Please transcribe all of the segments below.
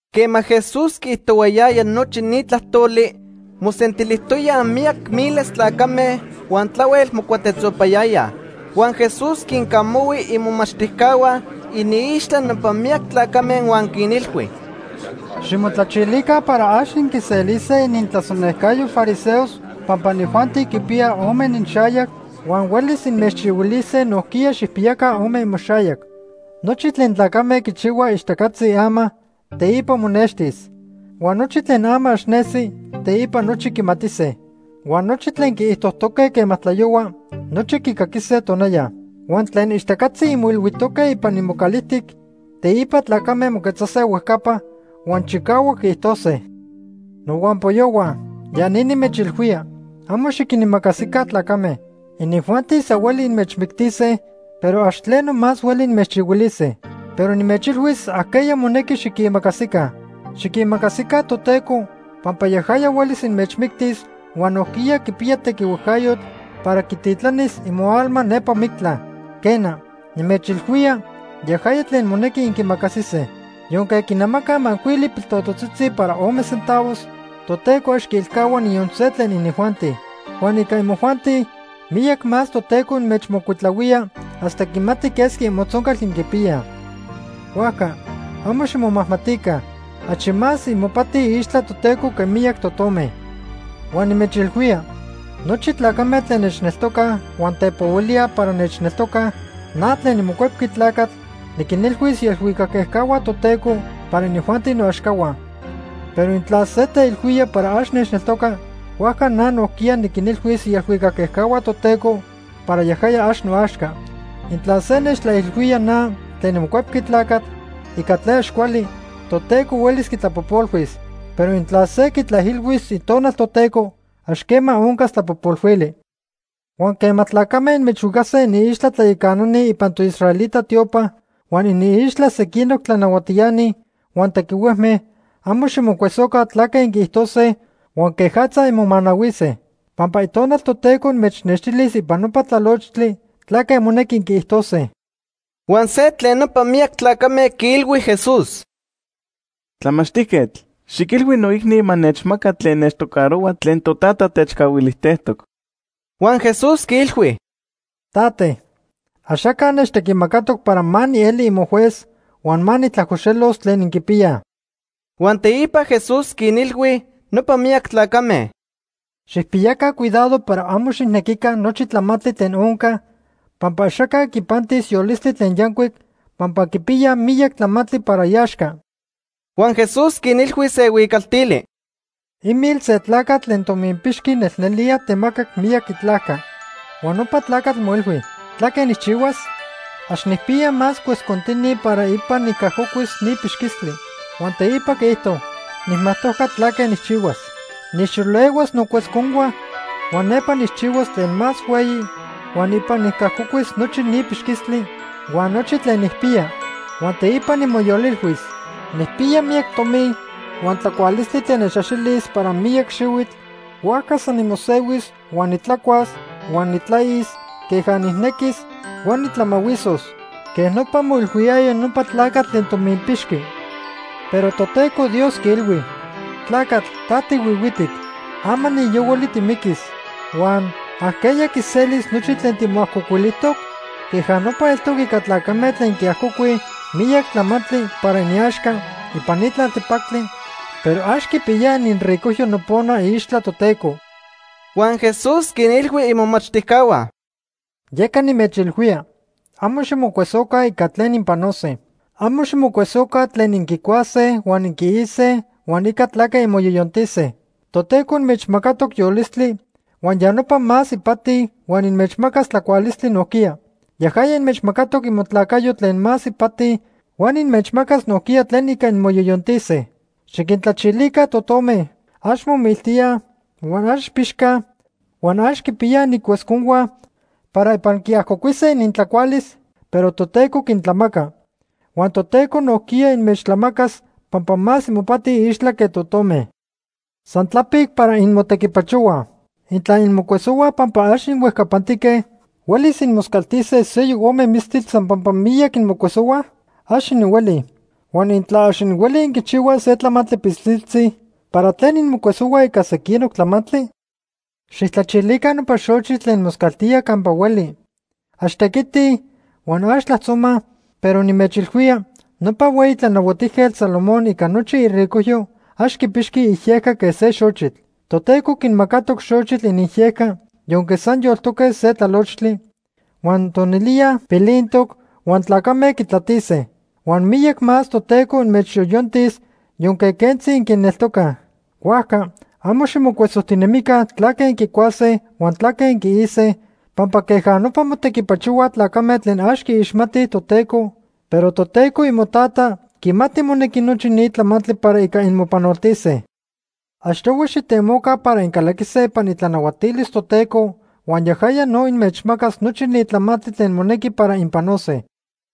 Quema Jesús quiijtohuayaya nochi ni tlajtoli, mosentilijtoyaj miyac miles tlacame huan tlahuel mocuatetzopayayaj. Huan Jesús quincamahui imomachtijcahua iniixtla nopa miyac tlacame huan quinilhui: “Ximotlachilica para ax inquiselise inintlasonejcayo fariseos pampa inijuanti quipiyaj ome ininxayac huan huelis inmechchihuilise nojquiya xijpiyaca ome imoxayac. Nochi tlen tlacame quichihuaj ixtacatzi ama, teipa monextis. Huan nochi tlen ama ax nesi, teipa nochi quimatise. Huan nochi tlen inquiijtojtoque quema tlayohua, nochi quicaquise tonaya. Huan tlen ixtacatzi inmoilhuijtoque ipan imocalijtic, teipa tlacame moquetzase huejcapa huan chicahuac quiijtose. “Nohuampoyohua ya ni nimechilhuía. Amo xiquinimacasica tlacame. Inijuanti san hueli inmechmictise, pero ax tleno más hueli inmechchihuilise. Pero nimechilhuis ajqueya monequi xiquiimacasica. Xiquimacasica Toteco, pampa yajaya huelis inmechmictis huan nojquiya quipiya tequihuejcayotl para quititlanis imoalma nepa mictla. Quena, nimechilhuía, yajaya tlen monequi inquimacasise. “Yonque quinnamacaj macuili piltototzitzi para ome centavos, Toteco ax quiilcahua niyon se tlen inijuanti. Huan ica imojuanti, miyac más Toteco inmechmocuitlahuía hasta quimati quesqui imotzoncal inquipiyaj. Huajca amo ximomajmatica. Achi más imopati iixtla Toteco que miyac totome. “Huan nimechilhuía, nochi tlacame tlen nechneltocaj huan tepohuilíaj para nechneltocaj, na tlen niMocuepqui Tlacatl, niquinilhuis ielhuicac ejcahua Toteco para inijuanti noaxcahua. Pero intla se teilhuía para ax nechneltoca, huajca na nojquiya niquinilhuis ielhuicac ejcahua Toteco para yajaya ax noaxca. “Intla se nechtlaijilhuía na tlen niMocuepqui Tlacatl ica tlen ax cuali, Toteco huelis quitlapojpolhuis. Pero intla se quitlaijilhuis Itonal Toteco, ax quema oncas tlapojpolhuili. “Huan quema tlacame inmechhuicase iniixtla tlayacanani ipan toisraelita tiopa huan iniixtla sequinoc tlanahuatiani huan tequihuejme, amo ximocuesoca tlaque inquiijtose huan quejatza inmomanahuise, pampa Itonal Toteco inmechnextilis ipan nopa tlalochtli tlaque monequi inquiijtose.” Huan se tlen nopa miyac tlacame quiilhui Jesús: ―Tlamachtijquetl, xiquilhui noicni ma nechmaca tlen nechtocarohua tlen totata techcahuilijtejtoc. Huan Jesús quiilhui: ―Tate, axaca nechtequimacatoc para ma nieli imojuez huan ma nijtlajcoxelos tlen inquipiyaj. Huan teipa Jesús quinilhui nopa miyac tlacame: ―Xijpiyaca cuidado para amo xijnequica nochi tlamantli tlen onca, pampa axaca quipantis yolistli tlen yancuic pampa quipiya miyac tlamantli para iaxca. Huan Jesús quinilhui se huicaltili: “Imil se tlacatl tlen tominpixqui nelnelía temacac miyac itlajca. Huan nopa tlacatl moilhui: ‘¿Tlaque nijchihuas? Ax nijpiya más cuescontini para ipan nicajcocuis ni pixquistli.’ Huan teipa quiijto: ‘Nijmajtojca tlaque nijchihuas. Nijxolehuas nocuesconhua huan nepa nijchihuas tlen más hueyi huan ipan nicajcocuis nochi ni pixquistli huan nochi tlen nijpiya.’ Huan teipa nimoyolilhuis: ‘Nijpiya miyac tomi huan tlacualistli tlen nechaxilis para miyac xihuitl, huajca san nimosehuis, huan nitlacuas huan nitlais queja nijnequis huan nitlamahuisos.’ Quej nopa moilhuiyaya nopa tlacatl tlen tominpixqui. Pero Toteco Dios quiilhui: ‘Tlacatl ta tihuihuitic. Ama ni yohuali timiquis, huan ¿ajqueya quiselis nochi tlen timoajcocuilijtoc?’ Queja nopa eltoc ica tlacame tlen quiajcocuij miyac tlamantli para iniaxca ipan ni tlaltepactli, pero ax quipiyaj ininricojyo nopona iixtla Toteco.” Huan Jesús quinilhui imomachtijcahua: “Yeca nimechilhuía, amo ximocuesoca ica tlen inpanose. Amo ximocuesoca tlen inquicuase huan inquiise huan ica tlaque inmoyoyontise. Toteco inmechmacatoc yolistli huan ya nopa más ipati huan inmechmacas tlacualistli nojquiya. Yajaya inmechmacatoc imotlacayo tlen más ipati huan inmechmacas nojquiya tlen ica inmoyoyontise. Xiquintlachilica totome. Ax momiltíaj, huan ax pixcaj huan ax quipiyaj inincuesconhua para ipan quiajcocuise inintlacualis, pero Toteco quintlamaca. Huan Toteco nojquiya inmechtlamacas pampa más imopati iixtla que totome. San tlapic para inmotequipachohuaj. Intla inmocuesohuaj pampa ax inhuejcapantique, ¿huelis inmoscaltise seyoc ome mistitl san pampa miyac inmocuesohuaj? Ax inhuelij. Huan intla ax inhuelij inquichihuaj se tlamantli pilsiltzi, ¿para tlen inmocuesohuaj ica sequinoc tlamantli? “Xijtlachilica nopa xochitl tlen moscaltíaj campa hueli. Ax tequitij huan ax tlajtzomaj, pero nimechilhuía, nopa hueyi Tlanahuatijquetl Salomón ica nochi iricojyo ax quipixqui iyejca que se xochitl. Toteco quinmacatoc xochitl iniyejca yonque san yoltoque se tlalochtli, huan tonilía pilintoc huan tlacame quitlatise. Huan miyac más Toteco inmechyoyontis yonque quentzi inquineltocaj. Huajca amo ximocuesojtinemica tlaque inquicuase huan tlaque inquise, pampa queja nopa motequipachohuaj tlacame tlen ax quiixmatij Toteco, pero Toteco imoTata quimati monequi nochi ni tlamantli para ica inmopanoltise. Achtohui xijtemoca para incalaquise ipan itlanahuatilis Toteco huan yajaya no inmechmacas nochi ni tlamantli tlen monequi para inpanose.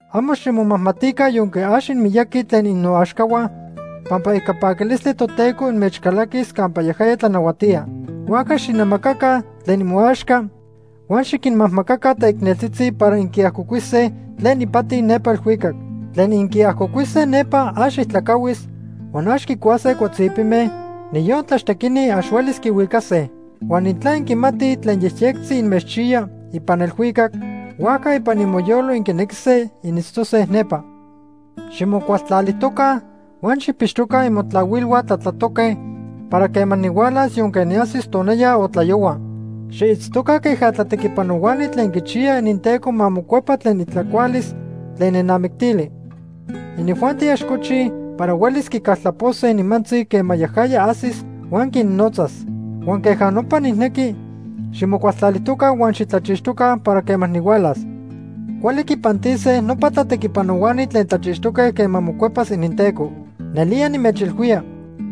“Amo ximomajmatica yonque ax inmiyaqui tlen innoaxcahua, pampa ica paquilistli Toteco inmechcalaquis campa yajaya tlanahuatía. Huajca xijnamacaca tlen imoaxca huan xiquinmajmacaca teicneltzitzi para inquiajcocuise tlen ipati nepa elhuicac. Tlen inquiajcocuise nepa ax ijtlacahuis huan ax quicuase cuatzipime, niyon tlaxtequini ax huelis quihuicase. Huan intla inquimatij tlen yejyectzi inmechchiya ipan elhuicac, huajca ipan imoyolo inquinequise initztose nepa. “Ximocualtlalijtoca huan xijpixtoca imotlahuilhua tlatlatoque para quema nihualas yonque niajsis tonaya o tlayohua. Xiitztoca queja tlatequipanohuani tlen quichiyaj ininteco ma mocuepa tlen itlacualis tlen nenamictili. Inijuanti ax cochij para huelis quicaltlapose nimantzi quema yajaya ajsis huan quinnotzas. Huan queja nopa nijnequi ximocualtlalijtoca huan xitlachixtoca para quema nihualas. Cuali quipantise nopa tlatequipanohuani tlen tlachixtoque quema mocuepas ininteco. Nelía nimechilhuía,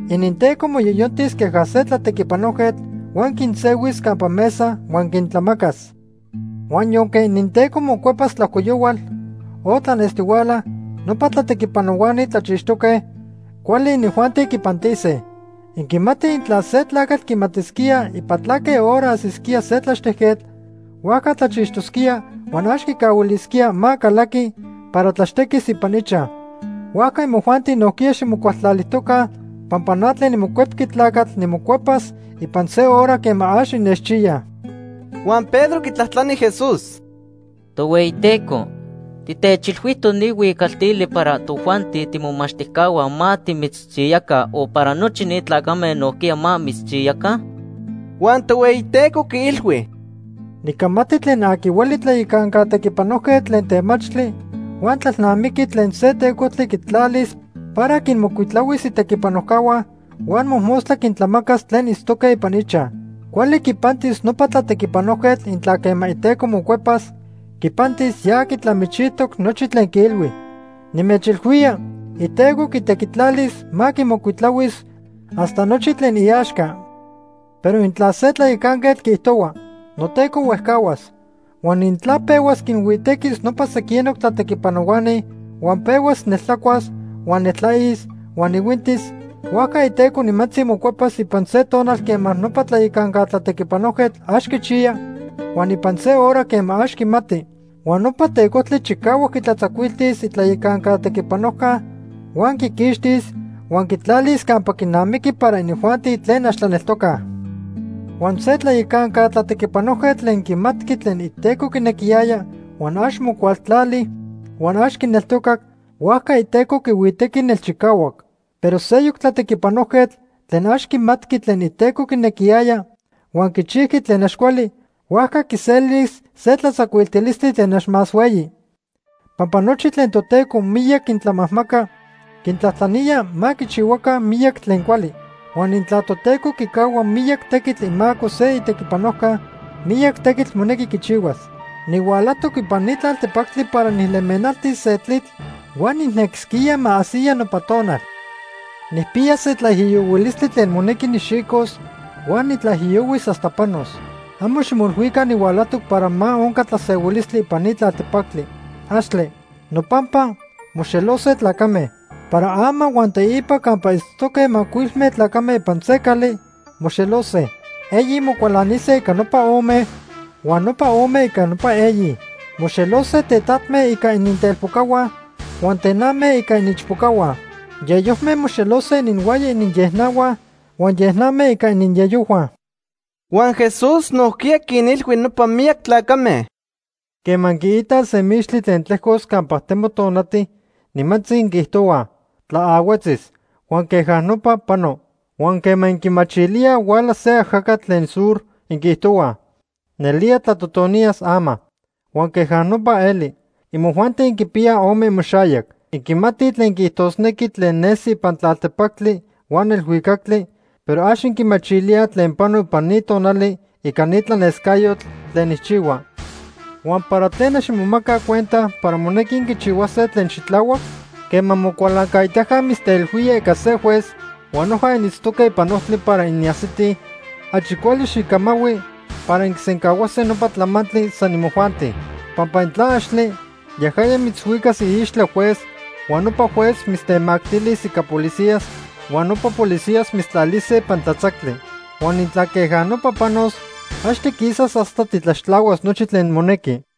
ininteco moyoyontis queja se tlatequipanojquetl huan quinsehuis campa mesa huan quintlamacas. Huan yonque ininteco mocuepas tlajcoyohual o tlanestihuala, nopa tlatequipanohuani tlachixtoque, cuali inijuanti quipantise. Inquimatij intla se tlacatl quimatisquía ipan tlaque hora ajsisquía se tlaxtejquetl, huajca tlachixtosquía huan ax quicahuilisquía ma calaqui para tlaxtequis ipan ichaj. Huajca imojuanti nojquiya ximocualtlalijtoca pampa na tlen niMocuepqui Tlacatl nimocuepas ipan se hora quema ax innechchiyaj.” Huan Pedro quitlajtlani Jesús: ―Tohueyiteco, ¿titechilhuijtoc ni huicaltili para tojuanti timomomachtijcahua ma timitzchiyaca o para nochi ni tlacame nojquiya ma mitzchiyaca? Huan Tohueyiteco quiilhui: “Nicamati tlen aqui hueli tlayacanca tequipanojquetl tlen temachtli huan tlalnamiqui tlen se tecojtli quitlalis para quinmocuitlahuis itequipanojcahua huan mojmostla quintlamacas tlen itztoque ipan ichaj. Cuali quipantis nopa tlatequipanojquetl intla quema iteco mocuepas, quipantis ya quitlamichijtoc nochi tlen quiilhui. Nimechilhuía iteco quitequitlalis ma quimocuitlahuis hasta nochi tlen iaxca. Pero intla se tlayacanquetl quiijtohua: ‘Noteco huejcahuas.’ Huan intla pehuas quinhuitequis nopa sequinoc tlatequipanohuani, huan pehuas neltlacuas, huan neltlais huan ihuintis, huajca iteco nimantzi mocuepas ipan se tonal quema nopa tlayacanca tlatequipanojquetl ax quichiya huan ipan se hora quema ax quimati. Huan nopa tecojtli chicahuac quitlatzacuiltis itlayacanca tequipanojca huan quiquixtis huan quitlalis campa quinamiqui para inijuanti tlen ax tlaneltocaj. “Huan se tlayacanca tlatequipanojquetl tlen quimatqui tlen iteco quinequiyaya huan ax mocualtlali huan ax quineltocac, huajca iteco quihuitequi nelchicahuac. Pero seyoc tlatequipanojquetl tlen ax quimatqui tlen iteco quinequiyaya, huan quichijqui tlen ax cuali, huajca quiselis se tlatzacuiltilistli tlen ax más hueyi. Pampa nochi tlen Toteco miyac quintlamajmaca, quintlajtlanía ma quichihuaca miyac tlen cuali. Huan intla Toteco quicahua miyac tequitl imaco se itequipanojca, miyac tequitl monequi quichihuas. “Nihualajtoc ipan ni tlaltepactli para nijlemenaltis se tlitl. Huan nijnequisquía ma ajsiya nopa tonal. Nijpiya se tlaijiyohuilistli tlen monequi nijxicos huan nitlaijiyohuis hasta panos. Amo ximoilhuica nihualajtoc para ma onca tlasehuilistli ipan ni tlaltepactli. ¡Axtle! Nopampa, moxelose tlacame. Para ama huan teipa campa itztoque macuilme tlacame ipan se cali, moxelose. Eyi mocualanise ica nopa ome, huan nopa ome ica nopa eyi. Moxelose tetatme ica inintelpocahua huan tename ica iniichpocahua. Yeyojme moxelose ininhuaya iniyejnahua huan yenajme ica iniyeyojhua.” Huan Jesús nojquiya quinilhui nopa miyac tlacame: “Quema inquiitaj se mixtli tlen tlejcos campa temo tonati, nimantzi inquiijtohuaj: ‘Tlaahuetzis’, huan queja nopa pano. Huan quema inquimachilíaj huala se ajacatl tlen sur, inquiijtohuaj: ‘Nelía tlatotoniyas ama.’ Huan queja nopa eli. Imojuanti inquipiyaj ome imoxayac. Inquimatij tlen quiijtosnequi tlen nesi ipan tlaltepactli huan elhuicactli, pero ax inquimachilíaj tlen pano ipan ni tonali ica ni tlanescayotl tlen nijchihua. “Huan, ¿para tlen ax inmomacaj cuenta para monequi inquichihuase tlen xitlahuac? Quema mocualancaitaca mitzteilhuía ica se juez huan noja initztoque ipan ojtli para inajsitij, achi cuali xijcamahui para inquisencahuase nopa tlamantli san imojuanti. Pampa intla axtle, yajaya mitzhuicas iixtla juez huan nopa juez mitztemactilis ica policías, huan nopa policías mitztlalise ipan tlatzactli. Huan intla queja nopa panos, ax tiquisas hasta titlaxtlahuas nochi tlen monequi.”